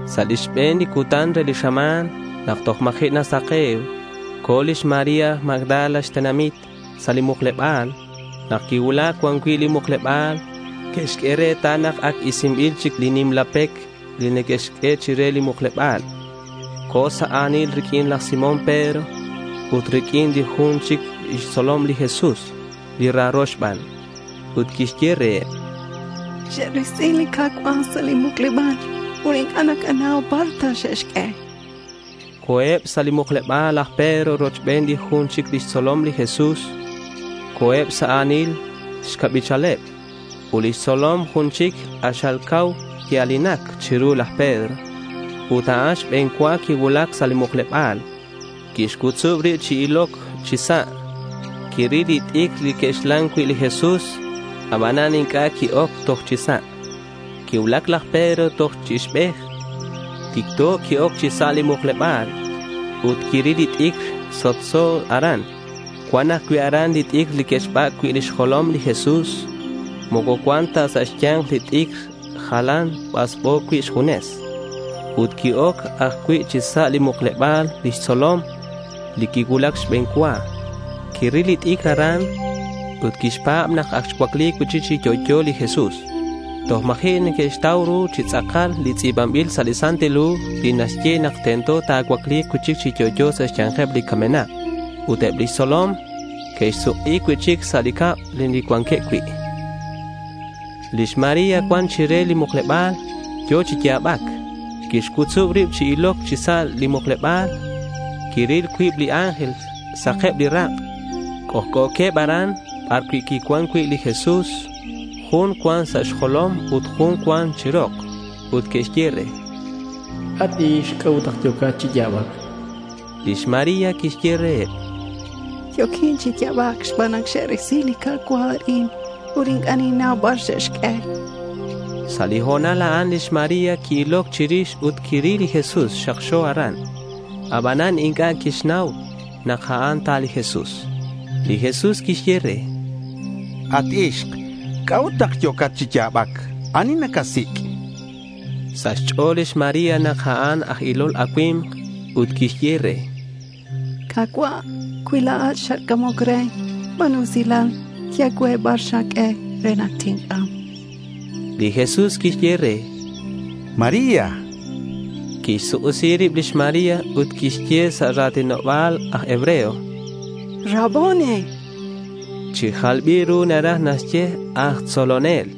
Sa' li xbe̱n li cutan re li xama̱n nak toj ma̱ji' nasake̱u co̱ lix María Magdala xtenamit sa' li mukleba̱l. Nak quicuulac cuan cui' li mukleba̱l, quixq'ue retal nak ac isinbil chic li nimla pec li que'xq'ue chire li mukleba̱l. Co̱ sa' a̱nil riq'uin laj Simón Pedro ut riq'uin li jun chic xtzolom li Jesús li raro xban, ut quixye reheb: —Xe'risi li Ka̱cua' sa' li mukleba̱l ut inc'a' nakanau bar ta xe'xq'ue, chan. Co̱eb sa' li mukleba̱l laj Pedro rochben li jun chic xtzolom li Jesús. Co̱eb sa' a̱nil xcabichaleb. Ut lix tzolom jun chic k'axal cau quia̱linac chiru laj Pedro ut a'an xbe̱n cua quicuulac sa' li mukleba̱l. Quixc'utzub rib chi iloc chi sa'. Quiril li t'icr li que'xlan cui' li Jesús. Abanan inc'a' qui-oc toj chi sa'. Quicuulac laj Pedro toj chi ixbej. Ticto qui-oc chi sa' li mukleba̱l ut quiril li t'icr sok'so aran. Cuan ajcui' aran li t'icr li que'xbac' cui' lix jolom li Jesús. Moco cuan ta sa' xya̱nk li t'icr. Jalan basbo cui' xjunes. Ut qui-oc ajcui' chi sa' li mukleba̱l li tzolom li quicuulac xbe̱n cua. Quiril li t'icr aran ut quixpa̱b nak ac xcuacli cui'chic chi yo'yo li Jesús. Toj ma̱ji' que'xtau ru chi tz'akal li tz'i̱banbil sa' li Santil Hu li naxye nak tento ta̱cuacli̱k cui'chic chi yo'yo sa' xya̱nkeb li camenak. Ut eb lix tzolom que'suk'i cui'chic sa' li cab li cuanqueb cui'. Lix María cuan chire li mukleba̱l. Yo̱ chi ya̱bac. Quixc'utzub rib chi iloc chi sa' li mukleba̱l. Quiril cuib li ángel sak li rak'eb. C'ojc'o̱queb aran bar quicuan cui' li Jesús. Jun cuan sa' xjolom ut jun cuan chi rok. Que'xye re: —At ixk, ¿c'a'ut nak yo̱cat chi ya̱bac?— Lix María quixye reheb: —Yo̱quin chi ya̱bac xban nak xe'risi li Ka̱cua' arin ut inc'a' ninnau bar xe'xq'ue.— Sa' li ho̱nal a'an, lix María qui-iloc chirix ut quiril li Jesús xakxo aran, abanan inc'a' quixnau nak a'an ta li Jesús. Li Jesús quixye re: —At ixk, ¿c'a'ut nak yo̱cat chi ya̱bac? ¿Ani nacasic'? chan. Sa' xch'o̱l lix María nak a'an aj ilol acui̱mk ut quixye re: —Ka̱cua', cui la̱at xatc'amoc re, ba̱nu usilal, ye cue bar xaq'ue re nak tinc'am, chan. Li Jesús quixye re: —¡María!— Quixsuk'isi rib lix María ut quixye sa' ra̱tinoba̱l aj hebreo: —Raboni.— (Chi jalbil ru naraj naxye aj tzolonel).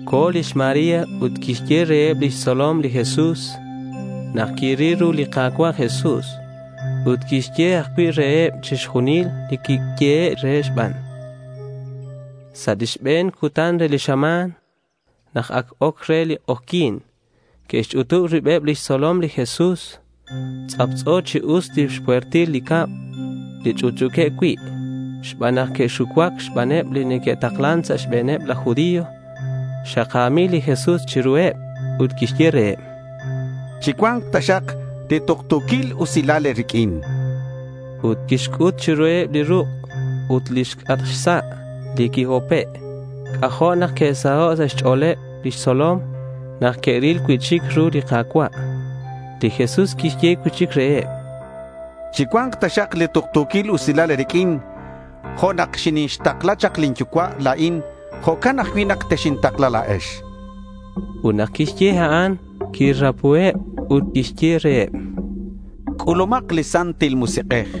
Co̱ lix María ut quixye reheb lix tzolom li Jesús nak quiril ru li Ka̱cua' Jesús ut quixye ajcui' reheb chixjunil li quiyehe' re xban. Sa' li xbe̱n cutan re li xama̱n, nak ac oc re li k'ojyi̱n, que'xch'utub ribeb lix tzolom li Jesús. Tz'aptz'o chi us lix puertil li cab li ch'utch'u̱queb cui' xban nak que'xucuac xbaneb li neque'taklan sa' xbe̱neb laj judío. Xaka̱mil li Jesús chiruheb ut quixye reheb: —Chicua̱nk taxak li tuktu̱quil usilal e̱riq'uin, chan reheb. Ut quixc'ut chiruheb li ruk' ut lix c'atk xsa' li quihope'. C'ajo' nak que'saho' sa' xch'o̱leb lix tzolom nak que'ril cui'chic ru li Ka̱cua'. Li Jesús quixye cui'chic reheb: —Chicua̱nk taxak li tuktu̱quil usilal e̱riq'uin. Jo' nak xinixtakla chak lin Yucua' la̱in, jo'can ajcui' nak texintakla la̱ex, chan. Ut nak quixye a'an, quirapuheb ut quixye reheb: —C'ulumak li Santil Musik'ej.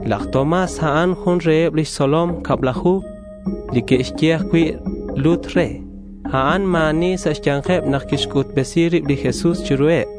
Laj Tomás, a'an jun reheb lix tzolom cablaju, li neque'xye ajcui' lut re. A'an ma̱ ani sa' xya̱nkeb nak quixc'utbesi rib li Jesús chiruheb.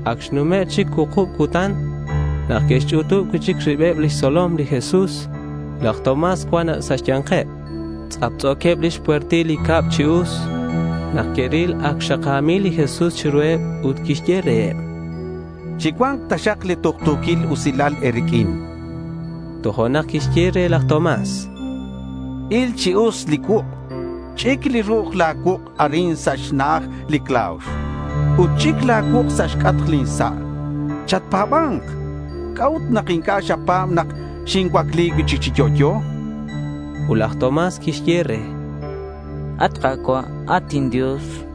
Ac xnume' chic cuukub cutan nak que'xch'utub cui'chic ribeb lix tzolom li Jesús. Laj Tomás cuan sa' xya̱nkeb. Tz'aptz'o̱queb lix puertil li cab chi us. Nak que'ril ac xaka̱mil li Jesús chiruheb ut quixye reheb: —Chicua̱nk taxak li tuktu̱quil usilal e̱riq'uin, chan. Tojo'nak quixye re laj Tomás: —Il chi us li cuuk'. Ch'ic li ru'uj la̱ cuuk' arin sa' xna'aj li claux. Ut ch'ic la̱ cuuk' sa' xc'atk lin sa'. Chatpa̱ba̱nk. ¿C'a'ut nak inc'a' xapa̱b nak xincuacli cui'chic chi yo'yo?— Ut laj Tomás quixye re: —¡At Ka̱cua', at inDios!—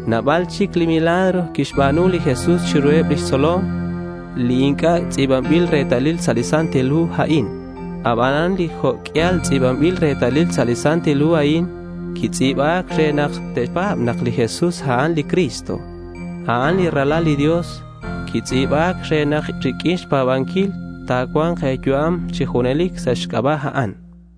Nabal chic li milagro quixba̱nu li Jesús chiruheb lix tzolom li inc'a' tz'i̱banbil retalil sa' li hu a'in. Abanan li jo' q'uial tz'i̱banbil retalil sa' li hu a'in, quitz'i̱ba̱c re nak te̱pa̱b nak li Jesús, a'an li Cristo. A'an li Ralal li Dios. Quitz'i̱ba̱c re nak riq'uin xpa̱banquil ta̱cua̱nk e̱yu'am chi junelic sa' xc'aba' a'an.